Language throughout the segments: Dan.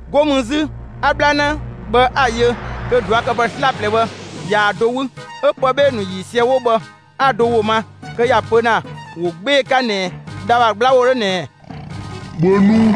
'Go mü 'zü 'a 'bhlanë bhë 'a‑ yö kö ꞊duakëpë 'slaplɛ bhë ꞊yaa‑ do 'wü; 'ö pë 'bhee‑ ‑nu ‑yiisië 'wo bhë 'a‑ do ‑wo ma kö ‑ya pö ‑na ‑wo 'gbee‑ 'ka ꞊nɛ dha ‑bha 'gbla ‑wo 'dhö ꞊nɛɛ: «‑Bhö nu!»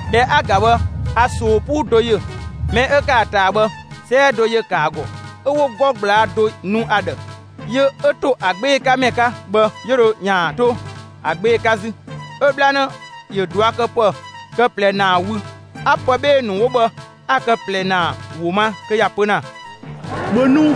꞊Dhɛ 'a‑ ‑ga bhë 'a ꞊soo 'puu do yö. Mɛ 'ö ‑kë ‑a ꞊taa bhë 'sɔɔn do ‑yö ‑kë ‑a ‑gɔ; 'ö 'wo 'gɔ ꞊gblaa' do nu ‑a ‑dhë. Yö 'ö ‑to ‑a 'gbee‑ 'ka ‑mɛ 'ka bhë, 'yö dho ‑yaan 'to ‑a 'gbee‑ 'ka 'zü. 'Ö 'bhlanë ‑yö ꞊duakëpë kë ꞊plɛ ‑naa wü; 'a pë 'bhee‑ ‑nu 'wo bhë ‑a kë ꞊plɛ ‑naa ‑wo ma kö ‑ya pö ‑na: «‑Bhö nu!»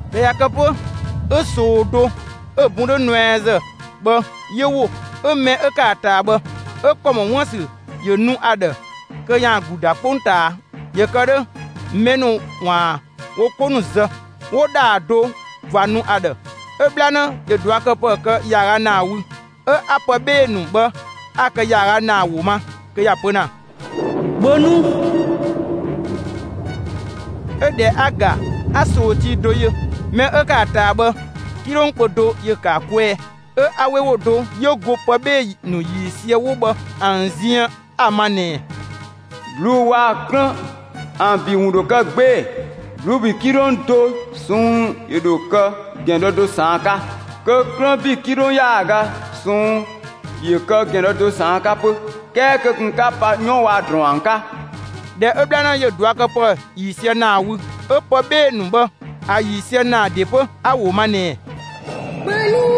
꞊Dhɛ ꞊ya kë 'pö 'ö ꞊soo do 'ö‑ bun 'dhö nuɛazë bhë 'yö ‑wo, 'ö mɛ 'ö ‑kë ‑a ꞊taa bhë, 'ö ‑kɔ ‑mɔ 'wuën‑ ‑sü ‑yö nu ‑a ‑dhë kö ‑yaan ‑glu ‑da 'kpongtaa, ‑yö kë 'dhö mɛ ‑nu ‑waan wo 'ko ‑nu zë. 'Wo ‑dhaa do ꞊va nu ‑a ‑dhë. 'Ö 'bhlanë ‑yö ꞊duakëpë kë ‑yaaga ‑naa wü; 'ö 'a pë 'bhee‑ ‑nu bhë ‑a kë ‑yaaga ‑naa ‑wo ma kö ‑ya pö ‑na: «‑Bhö nu!» 'Ö ꞊dhɛ 'a‑ ‑ga, 'a ꞊soo tii do yö. Mɛ 'ö ‑kë ‑a ꞊taa bhë 'kilong kpö do ‑yö ‑kë ‑a kwɛɛ. 'Ö 'a 'we ‑wo do 'yö go pë 'bhee‑ ‑nu ‑yiisië 'wo bhë ‑an ziën ‑a ma ꞊nɛɛ: «꞊Bluu'‑ waa‑ 'klën ‑an ‑bi ‑wun ‑dho kë 'gbee‑. ꞊Bluu'‑ ‑bi 'kilong do ꞊sɔnng' ‑yö ‑dho kë ‑gɛn dɔ do ꞊saan' 'ka; kö 'klën ‑bi 'kilong ‑yaaga ꞊sɔnng' ‑yö kë ‑gɛn dɔ do ꞊saan' 'ka 'pö. 'Kɛɛ kö ꞊kun 'ka pa 'yɔn waa‑ ‑drɔɔn ‑an 'ka!» ꞊Dhɛ 'ö 'bhlanë ‑yö ꞊duakëpë ‑yiisië ‑naa wü, 'ö pë 'bhee‑ ‑nu bhë ‑a ‑yiisië ‑naa ‑de 'pö 'a‑ ‑wo ma ꞊nɛɛ: «‑Bhö nu!»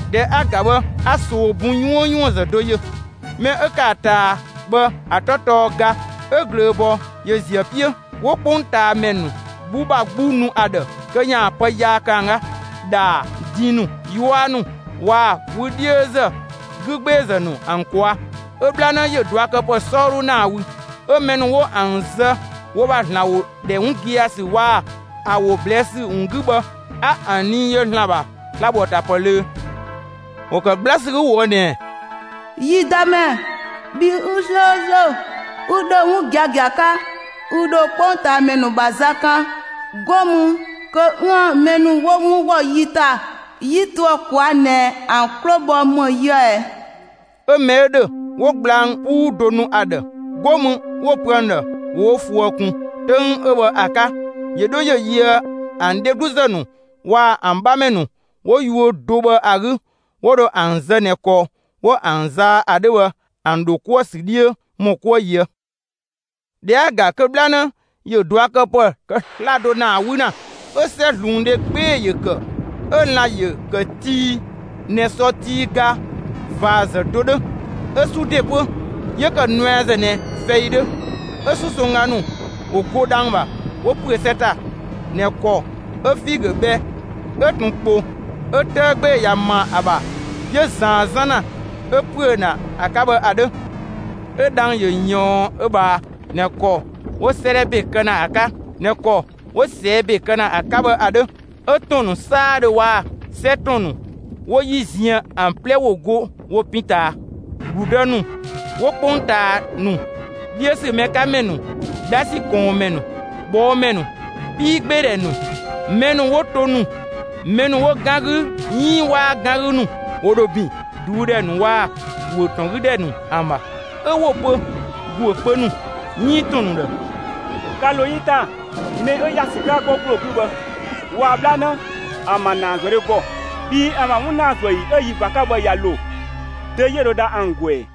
꞊Dhɛ 'a‑ ‑ga bhë 'a ꞊soo bun 'yuënyuënzë do yö. Mɛ 'ö ‑kë ‑a ꞊taa bhë ‑a 'tɔ tɔɔ ga, 'ö ꞊glööbɔɔ ‑yö ziö ‑a 'piö. 'Wo 'kpongtaamɛ ‑nu 'gbu ‑bha 'gbu nu ‑a ‑dhë kö ‑yaan pë yaa kë ‑an 'ka ‑dhaa, din ‑nu, 'yua ‑nu waa‑ wü 'dhiözë 'gügbeezë ‑nu ‑an ꞊kwaa'. 'Ö 'bhlanë ‑yö ꞊duakëpë 'sɔɔdhu ‑naa wü. 'Ö mɛ ‑nu 'wo ‑an zë wo ‑bha ‑Zlan ‑wo ‑dhɛ 'wun gia‑ ‑sü waa‑ ‑a ‑wo ꞊blɛɛ' ‑sü ‑wun 'gü bhë, 'a ‑an nii yö ‑Zlan ‑bha sla‑ ‑bho ‑a ‑ta ‑pë ꞊löö. ‑Wo ‑kë 'gbla ‑sü 'gü ꞊woë' ꞊nɛɛ: «Yi Dëmɛ, bhi 'ü 'slööslö, 'ü ‑dhö 'wun giagia 'ka, ü ‑dho 'kpongtaamɛ ‑nu ‑bha za kan, 'go mü kö 'üën‑ mɛ ‑nu 'wo 'wun ‑wɔ yi ‑ta, 'yi to ‑a ꞊kwaa' ꞊nɛ ‑an 'klo‑ bhɔ ‑më yië ꞊ɛ?» 'Ö mɛ 'ö ‑dhö 'wo gblang 'puu do nu ‑a ‑dhë, 'go mü 'wo‑ pö ‑an ‑dhë ‑wo wo ꞊fuë ꞊kun 'töng 'ö bhë ‑a 'ka, ‑yö 'dho ‑yö yöë ‑an dhegluzë ‑nu waa‑ ‑an 'bhamɛ ‑nu 'wo yuö do bhë ‑a 'gü 'wo dho ‑an zë ꞊nɛ ‑kɔ 'wo ‑an zaa ‑a 'dhö bhë ‑an ‑dho 'kuë‑ ‑sü 'dhiö ‑mɔ 'kuë ꞊yië'. ꞊Dhɛ 'a‑ ‑ga kö 'bhlanë ‑yö ꞊duakëpë kë 'slado ‑naa 'wü ‑na. 'Ö 'sɛzluundhe 'gbee‑ ‑yö ‑kë, 'ö lan‑ ‑yö ‑kë tii ꞊nɛ sɔ tii ga ꞊vaazë do 'dhö. 'Ö 'su ‑de 'pö 'yö ‑kë nuɛazë ꞊nɛ fɛi 'dhö. 'Ö 'susongga ‑nu ‑wo go dhang‑ ‑bha 'wo ‑püö 'sɛ ‑ta ꞊nɛ ‑kɔ 'ö figö bhɛ 'ö ꞊tun ‑kpo 'ö 'tëë 'gbee‑ ꞊ya ‑ma ‑a ‑bha 'yö ꞊zaan 'zan ‑na 'ö ‑püö ‑na ‑a 'ka bhë ‑a 'dhö. 'Ö dhang‑ ‑yö ꞊yɔɔn ö ꞊bhaa ꞊nɛ ‑kɔ 'wo 'sëëdhɛ ‑be kë ‑na ‑a 'ka (꞊nɛ ‑kɔ 'wo ꞊sɛɛ' ‑be kë ‑na ‑a 'ka bhë) ‑a 'dhö. 'Ö ‑tɔn ‑nu 'saadhö waa‑ 'sɛ ‑tɔn ‑nu 'wo 'yi ziën ‑an 'plɛ ‑wo go wo pin ꞊taa. ‑Gludë ‑nu 'wo 'kpongtaa ‑nu, 'dhiö ‑sü mɛ 'ka ‑mɛ ‑nu, 'dhasi ꞊kɔɔnmɛ ‑nu, ꞊bhɔɔmɛ ‑nu, 'piigbeedhɛ ‑nu, mɛ ‑nu 'wo to ‑nu, mɛ ‑nu 'wo 'gan 'gü 'iin 'waa 'gan 'gü ‑nu, ‑wo ‑dho ‑bin ꞊duudhɛ ‑nu waa‑ ‑guö ‑tɔn 'gü ‑dhɛ ‑nu ‑an ‑bha. 'Ö 'wo‑ pö ‑guö kpö ‑nu 'iin ‑tɔn ‑nu ‑dhë: «‑Ka ‑lo yi ‑ta mɛ 'ö ‑ya ‑sü 'ka 'gɔ ‑gbloo 'gü bhë waa‑ 'bhlanë ‑an ‑bha ‑naazuëdhe ‑gɔ. Bhii ‑an ‑bha 'wun ‑naa ‑an ‑zuë ‑yi 'ö yi ꞊va 'ka bhë ꞊ya ‑lo; dö 'yö dho dha ‑an ‑gɔ ‑ɛ?»